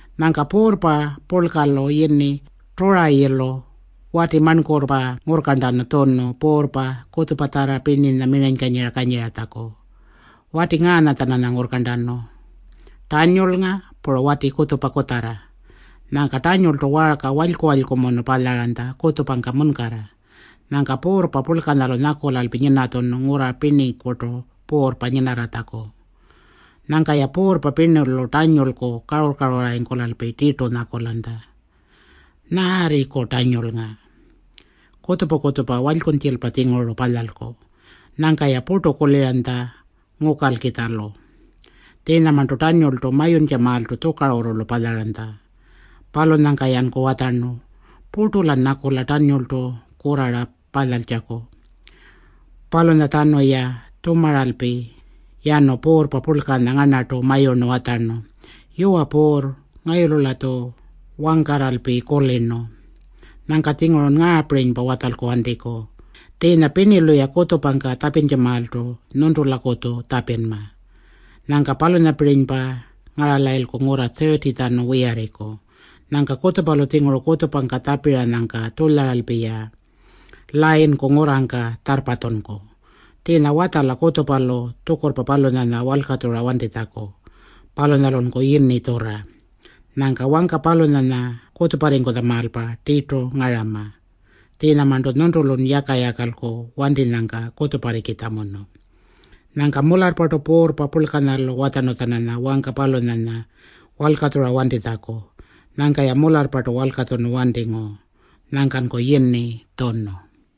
Nyangka puurrpa purlkalu yini Turayilu wati marnkurrpa ngurrkarntanu tjunu puurrpa kutjupatjarra pirninya miranykanyira kanyiratjaku. Wati ngaanya-tjananya ngurrkarntanu Tannyulnga puru wati kutjupa kutjarra. Nyangka Tannyultu waarka walyku-walykumunu palyaranytja kutjupangka munkarra. Nyangka puurrpa purlkanyalu nyakulalpi nyinatjunu ngurra pirnikurtu puurrpa nyinarratjaku. Nyangka-ya puurrpa pirnilu Tannyulku karurr-karurrarringkulalpi tirtu nyakulanytja, “Nyaarriku Tannyulnga? Kutjupa-kutjupa walykunytjilpa-tjinguru palyalku.” Nyangka-ya purtu kuliranytja ngukalkitjalu. Tjiinyamarntu Tannyultu mayuntjamaaltu tjukarurrulu palyaranytja. Palunyangka-yanku watjarnu, “Purtu-lan nyakula Tannyultu kurrara palyaltjaku.” Palunyatjanu-ya tjumaralpi yanu puurrpa purlkanya ngarnartu mayurnu watjarnu, “Yuwa puurr, ngayulu-latju wangkarralpi kulirnu. Nyangka-tjingurun ngaapirinypa watjalku wantiku. Tjiinya pirnilu-ya kutjupangka tjapintjamaaltu nyuntulakutju tjapinma. Nyangka palunyapirinypa ngaralayilku ngurra 30-tjanu wiyarriku. Nyangka kutjupalu tjinguru kutjupangka tjapiranyangka tjulyaralpi-ya layinku ngurrangka tjarrpatjunku. Tjiinya watjala kutjupalu tjukurrpa palunyanya walkatjura wantitjaku. Palunyalunku yini tjurra. Nyangka wangka palunyanya kutjuparringkutjamaalpa tirtu ngarama. Tjiinyamarntu nyuntulun yaka-yakalku wantinyangka kutjuparrikitjamunu.” Nyangka mularrpartu puurrpa purlkanyalu watjarnu-tjananya wangka palunyanya walkatjura wantitjaku. Nyangka-ya mularrpartu walkatjunu wantingu. Nyangkanku yini tjunu.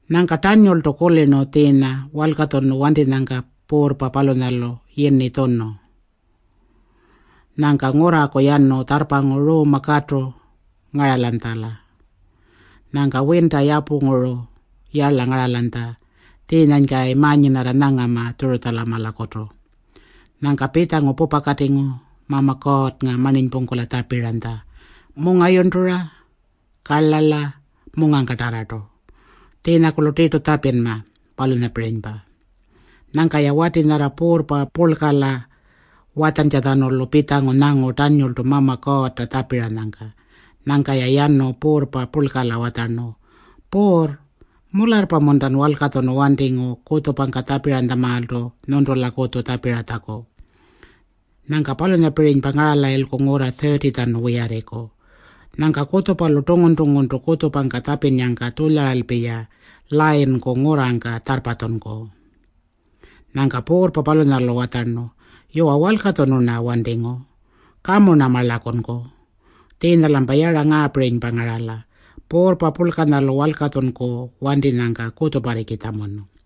Nyangka Tannyultu kulirnu tjiinya walkatjunu wantinyangka puurrpa palunyalu yini tjunu. Nyangka ngurraku yanu tjarrpangu ruumpa katu ngaralanytjala. Nyangka winta yapurranguru yarla ngaralanytja tjiinyanykayi ma-nyinarra nyangama Tjurutjamalakutu. Nyangka pitjangu pupakatingu Mama Kuurrnga marninypungkula tjapiranytja mungayurntura, karlarla, mungangkatarrartu. Tjiinyakurlu tirtu tjapinma, palunyapirinypa. Nyangka-ya wati nyarra puurrpa purlkala watjantjatjanulu pitjangu nyangu Tannyultu Mama Kuurrta tjapiranytja. Nyangka-ya yanu puurrpa purlkala watjarnu, “Puurr, mularrpa-muntan walkatjunu wantingu kutjupangka tjapiranytjamaaltu nyuntulakutju tjapiratjaku? Nyangka palunyapirinypa ngaralayilku ngurra 30-tjanu wiyarriku? Nyangka kutjupalu tungun-tunguntu kutjupangka tjapinnyangka tjulyaralpi-ya layinku ngurrangka tjarrpatjunku?” Nyangka puurrpa palunyalu watjarnu, “Yuwa, walkatjunu-rna wantingu. Kamu-rna marlakunku. Tjiinya-lampa yara ngaapirinypa ngarala: puurrpa purlkanyalu walkatjunku wantinyangka kutjuparrikitjamunu.”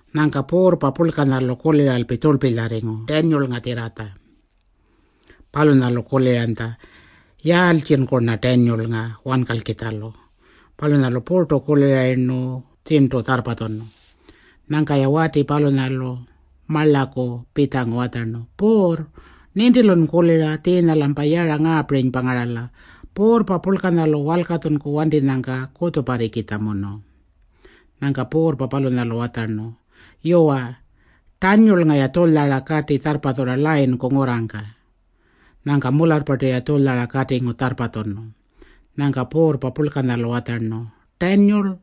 Nyangka puurrpa purlkanyalu kuliralpi tjurlpilyarringu Tannyulngatjirratja. Palunyalu kuliranytja, “Yaaltjinku-rna Tannyulnga wankalkitjalu?” Palunyalu purtu kulirayirnu tjirntu tjarrpatjunu. Nyangka-ya wati palunyalu marlaku pitjangu watjarnu, “Puurr, nintilun kulira tjiinya-lampa yara ngaapirinypa ngarala: puurrpa purlkanyalu walkatjunku wantinyangka kutjuparrikitjamunu.” Nyangka puurrpa palunyalu watjarnu, “Yuwa, Tannyulnga-ya tjulyara kati tjarrpatjurra layinku ngurrangka.” Nyangka mularrpartu-ya tjulyara katingu tjarrpatjunu. Nyangka puurrpa purlkanyalu watjarnu, “Tannyul,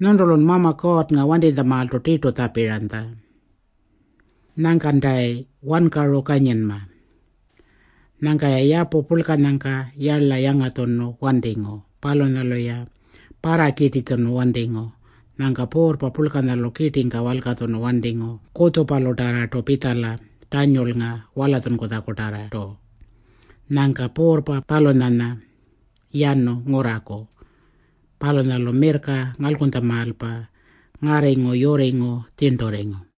nyuntulun Mama Kuurrnga wantinytjamaaltu tirtu tjapiranytja. Nyangkantayi wankaru kanyinma.” Nyangka-ya yapu purlkanyangka yarla yangatjunu wantingu. Palunyalu-ya parrakirtitjunu wantingu. Nyangka puurrpa purlkanyalu kirtingka walkatjunu wantingu kutjupalutarrartu pitjala Tannyulnga walatjunkutjakutarrartu. Nyangka puurrpa palunyanya yanu ngurraku. Palunyalu mirrka ngalkunytjamaalpa ngarringu yurringu tjirnturringu.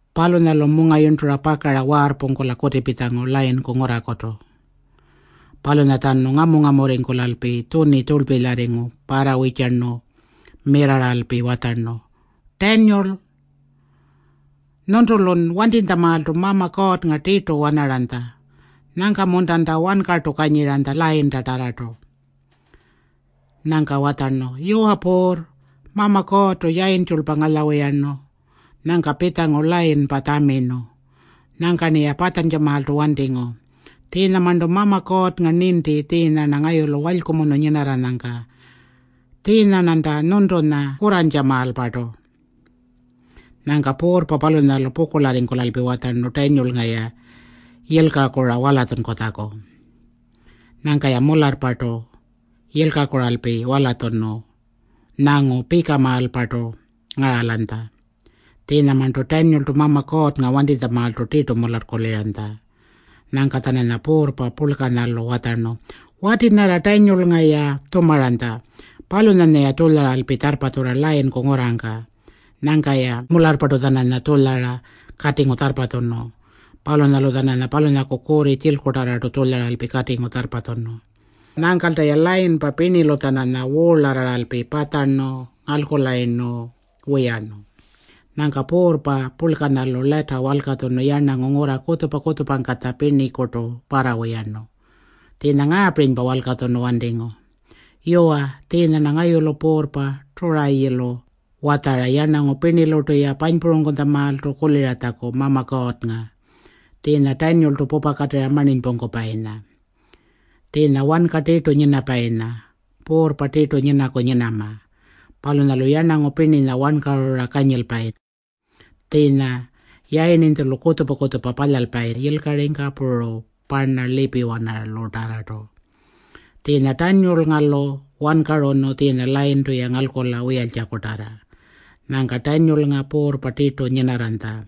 Palunyalu mungayurntura pakara waarrpungkula kutipitjangu layinku ngurrakutu. Palunyatjanu ngamu-ngamurringkulalpi tjuni tjurlpilypa parrawirrtjarnu mirrarralpi watjarnu, “Tannyul, nyuntulun wantinytjamaaltu Mama Kuurrnga tirtu wanaranytja. Nyangka-muntanta wankartu kanyiranytja layintatarrartu?” Nyangka watjarnu, “Yuwa puurr, Mama Kuurrtu yayintjulpa ngalyawiturnu. Nyangka pitjangu layinpa tjamirnu. Nyangka-rniya patjantjamaaltu wantingu. Tjiinyamarntu Mama Kuurrnga ninti tjiinya-rna ngayulu walykumunu nyinarranyangka. Tjiinya-rnanta nyuntunya kurrantjamaalpartu.” Nyangka puurrpa palunyalu pukurlarringkulalpi watjarnu Tannyulnga-ya yilkakura walatjunkutjaku. Nyangka-ya mularrpartu yilkakuralpi walatjunu nyangu pikamaalpartu ngaralanytja. Tjiinyamarntu Tannyultu Mama Kuurrnga wantinytjamaaltu tirtu mularrkuliranytja. Nyangka-tjananya puurrpa purlkanyalu watjarnu, “Wati nyarra Tannyulnga-ya tjumaranytja, palunyanya-ya tjulyaralpi tjarrpatjurra layinku ngurrangka.” Nyangka-ya mularrpartu-tjananya tjulyara katingu tjarrpatjunu. Palunyalu-tjananya palunyaku kurri tjilkutarrartu tjulyaralpi katingu tjarrpatjunu. Nyangkalta-ya layinpa pirnilu-tjananya wuurlarraralpi patjarnu ngalkulayirnu wiyarnu. Nyangka puurrpa purlkanyalu lata walkatjunu yarnangu ngurra kutjupa-kutjupangkatja pirnikurtu parrawiyarnu. Tjiinya ngaapirinypa walkatjunu wantingu: “Yuwa, tjiinya-rna ngayulu puurrpa Turayilu watjara yarnangu pirnilurtu-ya panypurangkutjamaaltu kuliratjaku Mama Kuurrnga, tjiinya Tannyultu pupakatirra marninypungkupayinya. Palunyanya wanka tirtu nyinapayinya puurrpa tirtu nyinaku nyinama. Palunyalu yarnangu pirninya wankarura kanyilpayi. Tjiinya yayirninytjulu kutjupa-kutjupa palyalpayi yilkaringka puru parna lipiwanalutarrartu. Tjiinya Tannyulnga-lu wankarunu tjiinya layintu-ya ngalkula wiyaltjakutarra.” Nyangka Tannyulnga puurrpa tirtu nyinarranytja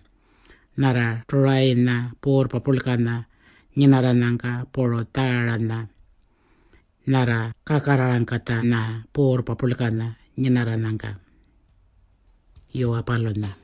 nyarra Turayinya puurrpa purlkanya nyinarranyangka puru Tjaaranya nyarra kakarrarangkatjanya puurrpa purlkanya nyinarranyangka. Yuwa, palunya.